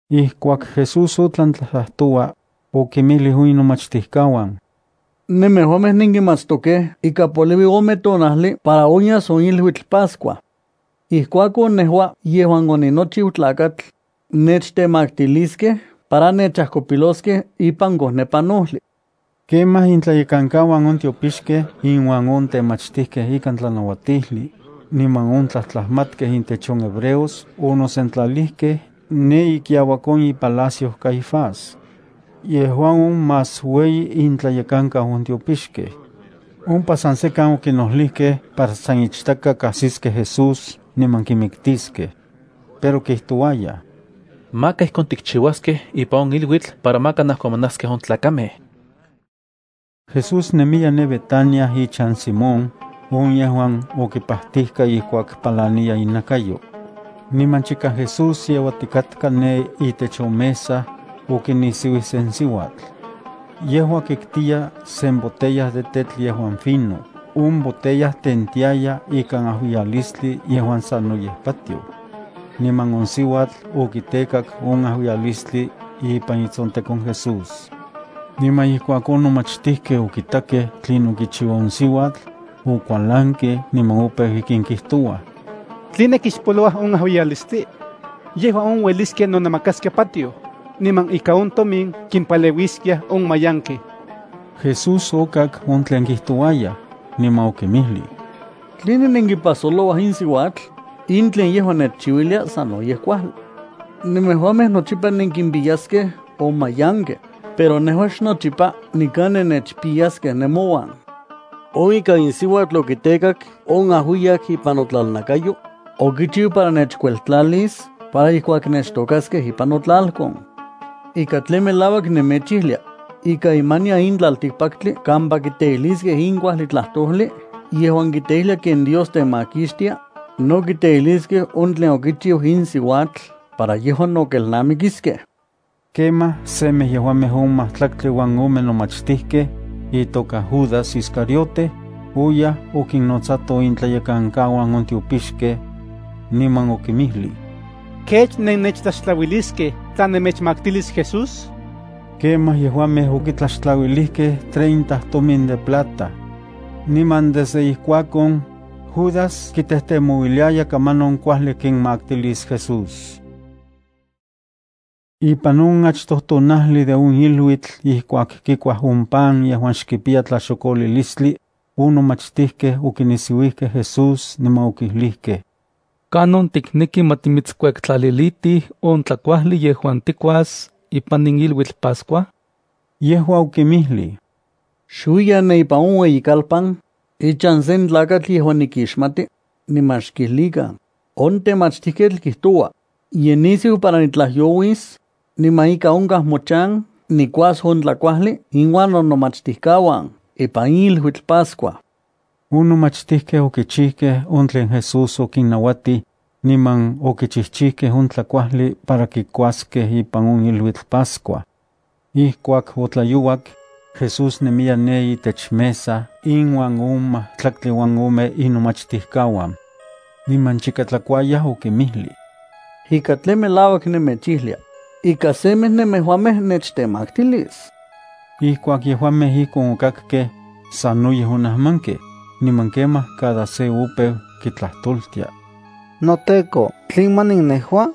Ijkuak Jesús otlan tlajtlajtoua, okinmijlij on inomachtijkauan: —Nemejuamej nenkimatstokej ika poliui ome tonajli para onyas on iluitl Pascua. Ijkuakon nejua yejuan oninochiu Tlakatl, nechtemaktiliskej para nechajkopiloskej ipan kojnepanojli. Kemaj, intlayekankauan on tiopixkej inuan on temachtijkej ikan tlanauatijli, niman on tlajtlajmatkej intech on hebreos onosentlalijkej ne ikiauak on ipalacio Caifás. Yejua on más ueyi intlayekankau on tiopixkej. Ompa san sekan okinojlijkej para san ichtaka kajsiskej Jesús niman kimiktiskej. Pero kijtouayaj: —Maka ijkon tikchiuaskej ipan on iluitl para maka najkomanaskej on tlakamej. Jesús nemiya ne Betania ichan Simón, on yejuan okipajtijka ijkuak palaniya inakayo. Niman chika Jesús yeuatikatka ne itech on mesa, okinisiuij sen siuatl. Yejua kiktiya sen botella de tetl yejuan fino. On botella tentiaya ikan ajuiyalistli yejuan sanoyej patioj. Niman on siuatl okitekak on ajuiyalistli ipan itsontekon Jesús. Niman ijkuak on nomachtijkej okitakej tlinon kichiua on siuatl, okualankej niman opeu ijkin kijtouaj: —¿Tline kixpoloua on ajuiyalistli? Yejua on ueliskia nonamakaskia patioj, niman ika on tomin kimpaleuiskiaj on mayankej. Jesús okak on tlen kijtouayaj, niman okinmijlij: —¿Tline nenkipajsolouaj in siuatl? In tlen yejua nechchiuilia sanoyej kuajli. Nemejuamej nochipa nemouan nenkimpiyaskej on mayankej, pero nejua xnochipa nikan nennechpiyaskej nemouan. On ika in siuatl okitekak on ajuiyak ipan notlalnakayo, okichiu para nechkueltlalis para ijkuak nechtokaskej ipan notlalkon. Ika tlen melauak nemechijlia, ika imanian in tlaltikpaktli kampa kiteijliskej in kuajli tlajtojli yejuan kiteijlia ken Dios temakixtia, no kiteijliskej on tlen okichiu in siuatl para yejua no kelnamikiskej. Kemaj semej yejuamej on majtlaktli uan ome nomachtijkej, itoka Judas Iscariote, oyaj okinnotsato intlayekankauan on tiopixkej, niman okinmijlij: —¿Kech nennechtlaxtlauiliskej tla nemechmaktilis Jesús? Kemaj yejuamej okitlaxtlauilijkej treinta tomin de plata. Niman desde ijkuakon, Judas kitejtemouiliaya kamanon kuajli kinmaktilis Jesús. Ipan on achtoj tonajli de on iluitl ijkuak kikuaj on pan yejuan xkipiya tlaxokolilistli, on nomachtijkej okinisiuijkej Jesús niman okijlijkej: —¿Kanon tikneki ma timitskuektlalilitij on tlakuajli yejuan tikuas ipan in iluitl Pascua? Yejua okinmijlij: —Xuiyan ne ipan on ueyikalpan, ichan sen tlakatl yejuan nikixmati, niman xkijlikan: “On temachtijketl kijtoua: Ye nisiu para nitlajyouis, niman ika onkaj mochan nikuas on tlakuajli inuan nonomachtijkauan ipan in iluitl Pascua.” On nomachtijkej okichijkej on tlen Jesús okinnauatij, niman okichijchijkej on tlakuajli para kikuaskej ipan on iluitl Pascua. Ijkuak otlayouak, Jesús nemiya ne itech mesa inuan on majtlaktli uan ome inomachtikauan. Niman chika tlakuayaj, okinmijlij: —Ika tlen melauak nemechijlia, ika semej nemejuamej nechtemaktilis. Ijkuak yejuamej ijkon okakkej, sanoyej onajmankej, niman kemaj cada se opeu kitlajtoltia: —NoTEKO, ¿tlen manin nejua?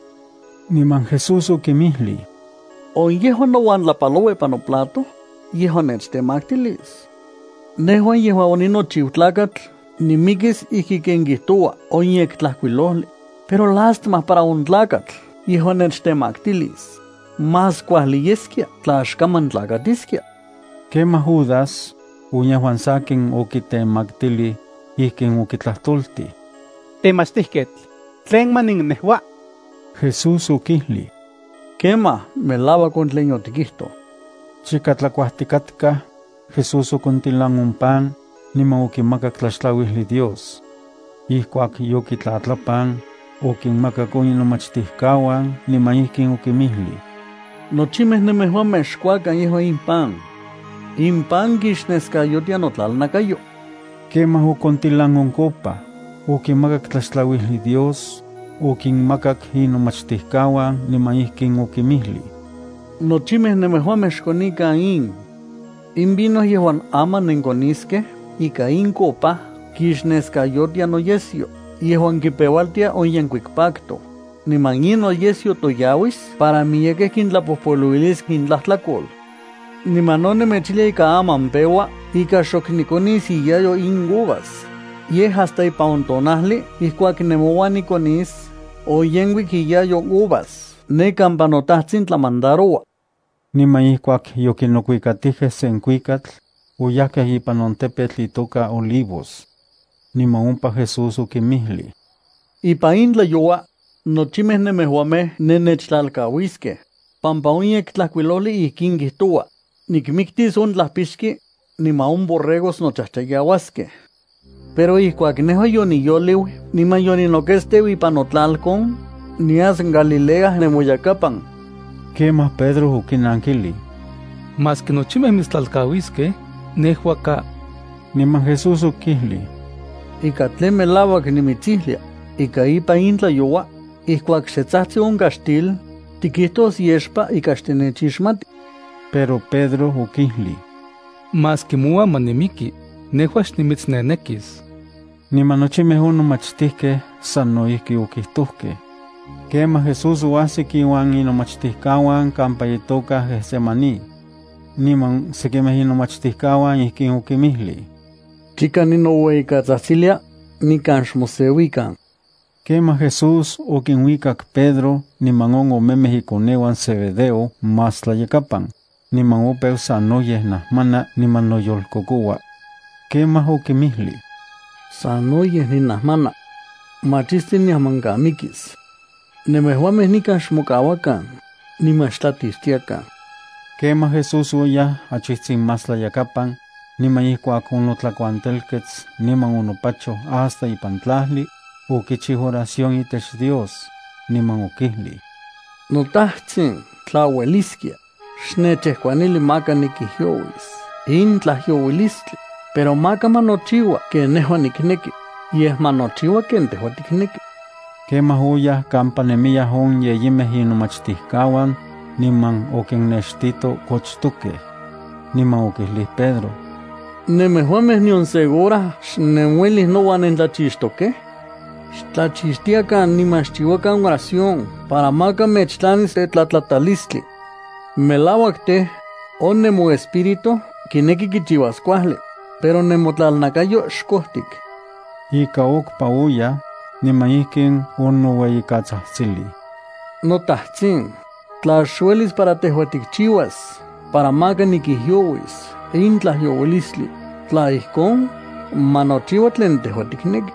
Niman Jesús okinmijlij: —On yejuan nouan tlapaloua ipan noplato, yejua nechtemaktilis. Nejua yejuan oninochiu Tlakatl nimikis ijki ken kijtoua on Yektlajkuilojli, pero ¡lástima para on tlakatl yejuan nechtemaktilis! Más kuajli yeskia tla xkaman tlakatiskia. Kemaj Judas, on yejuan sakin okitemaktilij, ijkin okitlajtoltij: —Temachtijketl, ¿tlen manin nejua? Jesús okijlij: —Kemaj. Melauak on tlen yotikijtoj. Chika tlakuajtikatkaj, Jesús okontilan on pan, niman okimakak tlaxtlauijli Dios. Ijkuak yokitlatlapan, okinmakak on inomachtijkauan, niman ijkin okinmijlij: —Nochimej nemejuamej xkuakan yejua in pan. In pan kixneskayotia notlalnakayo. Kemaj okontilan on copa, okimakak tlaxtlauijli Dios, okinmakak inomachtijkauan niman ijkin okinmijlij: —Nochimej nemejuamej xkonikan in. In vino yejuan aman nenkoniskej ika in copa kixneskayotia noyesyo yejuan kipeualtia on yenkuik pacto, niman in noyesyo toyauis para miyekej kintlapojpoluilis intlajtlakol. Niman no nemechijlia ika aman peua ika xok nikonis iyayo in uvas, yej hasta ipan on tonajli ijkuak nemouan nikonis on yenkuik iyayo uvas ne kampa noTajtsin tlamandaroua. Niman ijkuak yokinokuikatijkej sen kuikatl, oyajkej ipan on tepetl itoka Olivos. Niman ompa Jesús okinmijlij: —Ipan in tlayoua, nochimej nemejuamej nennechtlalkauiskej, pampa on Yektlajkuilojli ijkin kijtoua: “Nikmiktis on tlajpixki, niman on borregos nochajchayauaskej.” Pero ijkuak nejua yoniyoliu niman yoninoketsteu ipan notlalkon, nias Galilea nemoyakapan. Kemaj Pedro okinankilij: —Maski nochimej mitstlalkauiskej, nejua ka. Niman Jesús okijlij: —Ika tlen melauak nimitsijlia, ika ipan in tlayoua, ijkuak xe tsajtsi on kaxtil, tikijtos yexpa ika xtinechixmati. Pero Pedro okijlij: —Maski mouan ma nimiki, nejua xnimitsnenekis. Niman nochimej on nomachtijkej sano ijki okijtojkej. Kemaj Jesús oajsik iuan inomachtijkauan kampa itoka Getsemaní. Niman sekimej inomachtijkauan ijkin okinmijlij: —Chika ninoueyikatsajtsilia, nikan xmoseuikan. Kemaj Jesús okinuikak Pedro niman on omemej ikoneuan Zebedeo más tlayakapan, niman opeu sanoyej najmana niman noyolkokoua. Kemaj okinmijlij: —Sanoyej ninajmana. Machisti niajmankamikis. Nemejuamej nikan xmokauakan, niman xtlachixtiakan. Kemaj Jesús oyaj achijtsin más tlayakapan, niman ijkuak onotlakuantelkets niman onopachoj hasta ipan tlajli, okichiu oración itech Dios, niman okijlij: —NoTajtsin, tla ueliskia, xnechkauili maka nikijyouis in tlajyouilistli, pero maka ma nochiua ken nejua nikneki, yej ma nochiua ken tejua tikneki. Kemaj oyaj kampa nemiyaj on yeyimej inomachtijkauan, niman okinnextito kochtokej. Niman okijlij Pedro: —¿Nemejuamej nion se hora xnenuelij nouan nentlachixtokej? Xtlachixtiakan niman xchiuakan oración para maka mechtlanis tetlatlatalistli. Melauak tej, on nemoespíritu kineki kichiuas kuajli, pero nemotlalnakayo xkojtik. Ika okpa oyaj, niman ijkin onoueyikatsajtsilij: —NoTajtsin, tla xuelis para tejua tikchiuas para maka nikijyouis in tlajyouilistli, tla ijkon, ma nochiua tlen tejua tikneki.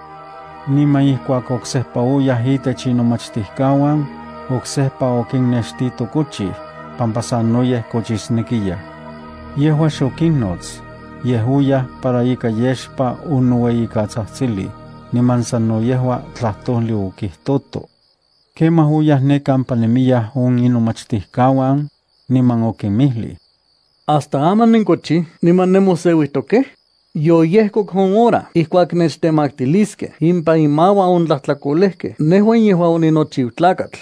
Niman ijkuak oksejpa oyaj itech inomachtijkauan, oksejpa okinnextito kochij, pampa sanoyej kochisnekiyaj. Yejua xokinnots, yej oyaj para ika yexpa onoueyikatsajtsilij, niman sano yejua tlajtojli okijtoto. Kemaj oyaj ne kampa nemiyaj on inomachtijkauan, niman okinmijlij: —¿Hasta aman nenkochij niman nenmoseuijtokej? Yoyejkok on hora ijkuak nechtemaktiliskej ipan inmauan on tlajtlakolejkej nejua yejuan oninochiu Tlakatl.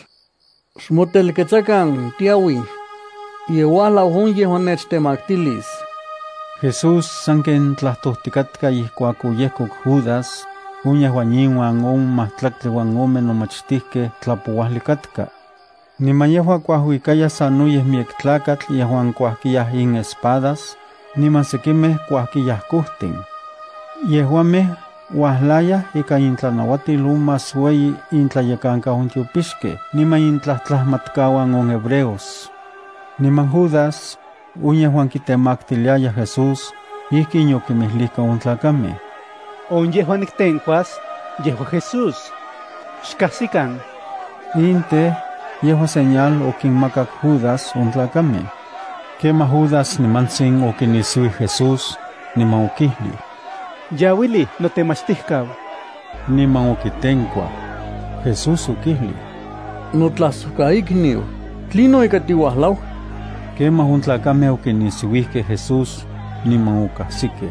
Xmotelketsakan. Tiauij. Ye uajlau on yejuan nechtemaktilis. Jesús sanken tlajtojtikatka ijkuak oyejkok Judas, on yejuan inuan on majtlaktli uan ome nomachtijkej tlapouajli katka. Niman yejua kuajuikaya sanoyej miyek tlakatl yejuan kuajkiyaj inespadas, niman sekimej kuajkiyaj kojtin. Yejuamej uajlayaj ikan intlanauatil on más ueyi intlayekankau on tiopixkej niman intlajtlajmatkauan on hebreos. Niman Judas, on yejuan kitemaktiliaya Jesús, ijkin yokinmijlijka on tlakamej: —On yejuan niktenkuas, yejua Jesús. Xkajsikan. In tej, yejua señal okinmakak Judas on tlakamej. Kemaj Judas nimantsin okinisiuij Jesús, niman okijlij: —¡Yauilij notemachtijkau! Niman okitenkuaj. Jesús okijlij: —Notlajsojkaikniu, ¿tlinon ika tiuajlau? Kemaj on tlakamej okinisiuijkej Jesús, niman okajsikej.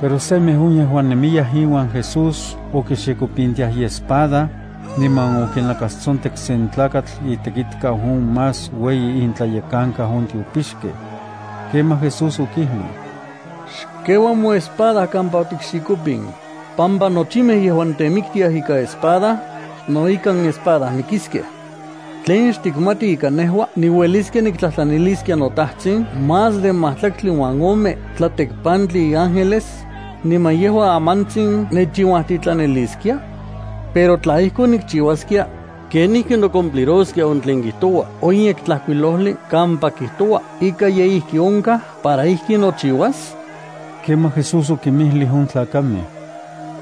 Pero semej on yejuan nemiyaj iuan Jesús okixikopintiaj iespada, niman okinakastsontek sen tlakatl itekitkau on más ueyi intlayekankau on tiopixkej. Kemaj Jesús okijlij: —Xkeua moespada kampa otikxikopin, pampa nochimej yejuan temiktiaj ikan espada, no ikan espada mikiskej. ¿Tlen xtikmati ika nejua niueliskia niktlajtlaniliskia noTajtsin más de majtlaktli uan ome tlatekpantli iángeles, niman yejua amantsin nechinuajtitlaniliskia? Pero tla ijkon nikchiuaskia, ¿kenijki nochiuas on tlen kijtoua on Yektlajkuilojli kampa kijtoua ika ye ijki onkaj para ijkin nochiuas? Kemaj Jesús okinmijlij on tlakamej: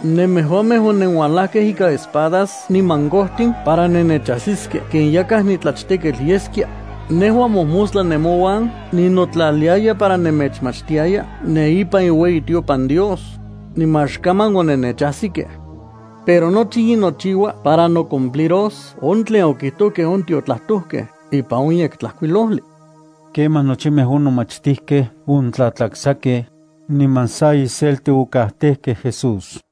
—¿Nemejuamej onenualajkej ikan espadas niman kojtin para nennechajsiskej ken yakaj nitlachteketl yeskia? Nejua mojmostla nemouan ninotlaliaya para nemechmachtiaya ne ipan iueyitiopan Dios, niman xkaman onennechajsikej. Pero nochi in nochiua para nocumpliros on tlen okijtojkej on tiotlajtojkej ipan on Yektlajkuilojli. Kemaj nochimej on nomachtijkej ontlatlaksakej, niman sa iselti okajtejkej Jesús.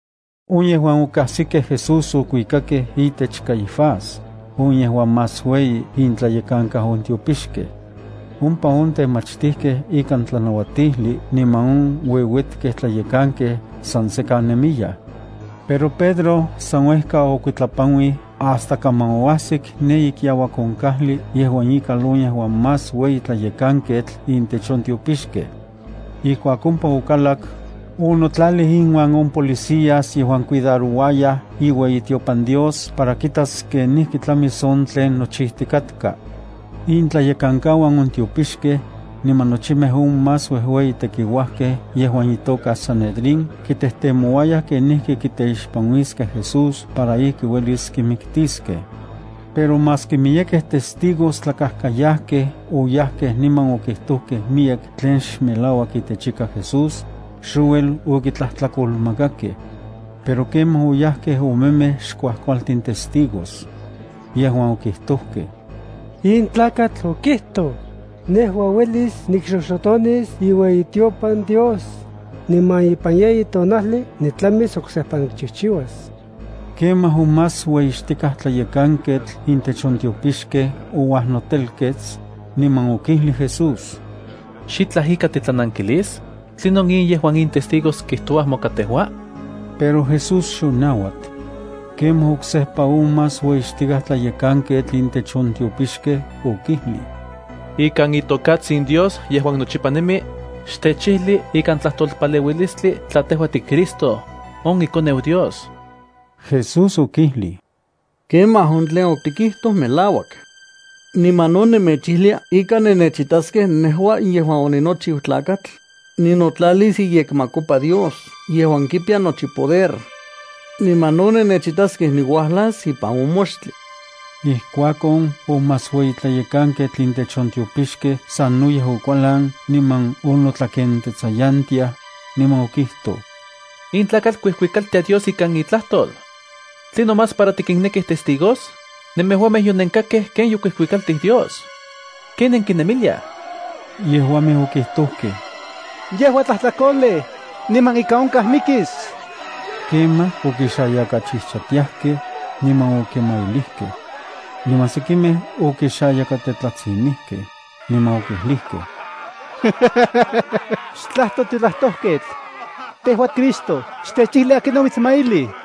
On yejuan okajsikej Jesús okuikakej itech Caifás, on yejuan más ueyi intlayekankau on tiopixkej. Ompa on temachtijkej ikan tlanauatijli niman on ueuetkej tlayekankej san sekan nemiyaj. Pero Pedro san uejka okuitlapanuij hasta kaman oajsik ne ikiauak on kajli yejuan ikal on yejuan más ueyi tlayekanketl intech on tiopixkej. Ijkuak ompa okalak, onotlalij inuan on policías yejuan cuidarouayaj iueyitiopan Dios para kitas kenijki tlamis on tlen nochijtikatka. Intlayekankauan on tiopixkej, niman nochimej on más uejueyi tekiuajkej ipan on sanedrín kitejtemouayaj kenijki kiteixpanuiskej Jesús para ijki uelis kimiktiskej. Pero maski miyekej testigos tlakajkayajkej oyajkej niman okijtojkej miyek tlen xmelauak itechika Jesús, xouel okitlajtlakolmakakej. Pero kemaj oyajkej omemej xkuajkualtin testigos. yejuan okijtojkej: —In tlakatl okijtoj: “Nejua uelis nikxoxotonis iueyitiopan Dios, niman ipan yeyi tonajli nitlamis oksejpa nikchijchiuas.” Kemaj on más ueyixtikaj tlayekanketl intech on tiopixkej ouajnotelkets, niman okijlij Jesús: —¿Xitlaj ika titlanankilis? ¿Tlinon in yejuan in testigos kijtoua moka tejua? Pero Jesús xonauat. Kemaj oksejpa on más ueyixtikaj tlayekanketl intech on tiopixkej okijlij: —Ikan itokatsin Dios yejuan nochipa nemi, xtechijli ikan tlajtolpaleuilistli tla tejua tiCristo, on iKoneu Dios. Jesús okijlij: —Kemaj, on tlen otikijtoj melauak. Niman no nemechijlia ika nennechitaskej nejua yejuan oninochiu Tlakatl, ninotlalis iyekmakopa Dios yejuan kipiya nochi poder. Niman no nennechitaskej niuajlas ipan on moxtli. Ijkuakon on más ueyi tlayekanketl intech on tiopixkej sanoyej okualan niman onotlakentsayantiaj, niman okijtoj: —In tlakatl kuijuikaltia Dios ikan itlajtol. ¿Tlinon más para tikinnekij testigos? Nemejuamej yonenkakkej ken yokuijuikaltij Dios. ¿Ken nenkinemiliaj? Yejuamej okijtojkej: —Yejua tlajtlakolej, niman ika onkaj mikis. Kemaj okixayakachijchatiajkej, niman okimailijkej. Niman sekimej okixayakatetlatsinijkej, niman okijlijkej: —Xtlajto tiotlajtojketl. Tejua Cristo, xtechijli akinon omitsmailij.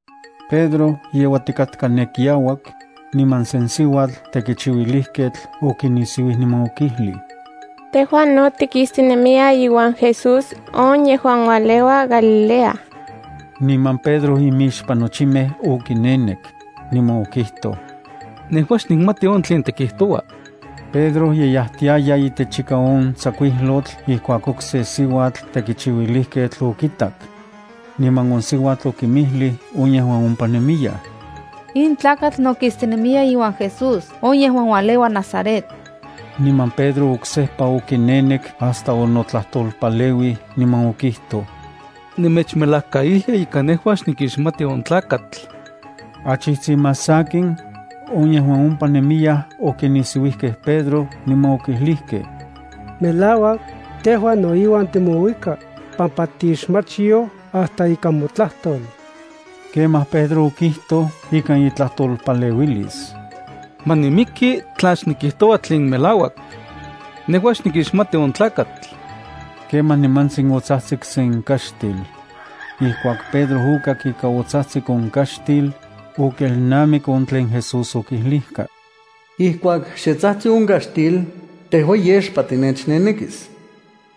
Pedro yeuatikatka ne kiauak, niman sen siuatl tekichiuilijketl okinisiuij niman okijlij: —Tejua no tikistinemiya iuan Jesús, on yejuan ualeua Galilea. Niman Pedro imixpan nochimej okinenek, niman okijtoj: —Nejua xnikmati on tlen tikijtoua. Pedro ye yajtiaya itechika on tsakuijlotl ijkuak okse siuatl tekichiuilijketl okitak. Niman on siuatl okinmijlij on yejuan ompa nemiyaj: —In tlakatl no kistinemiya iuan Jesús on yejuan ualeua Nazaret. Niman Pedro oksejpa okinenek hasta onotlajtolpaleuij niman okijtoj: —Nemechmelajkaijlia ika nejua xnikixmati on tlakatl. Achijtsin más sakin, on yejuan ompa nemiyaj okinisiuijkej Pedro niman okijlijkej: —Melauak, tejua no iuan timouika, pampa tixmachyoj hasta ika motlajtol. Kemaj Pedro okijtoj ikan itlajtolpaleuilis: —¡Ma nimiki tla xnikijtoua tlen melauak! Nejua xnikixmati on tlakatl. Kemaj nimantsin otsajtsik sen kaxtil. Ijkuak Pedro okak ika otsajtsik on kaxtil, okelnamik on tlen Jesús okijlijka: “Ijkuak xe tsajtsi on kaxtil, tejua yexpa tinechnenekis.”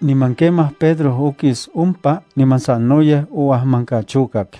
Niman kemaj Pedro okis ompa niman sanoyej oajmankachokak.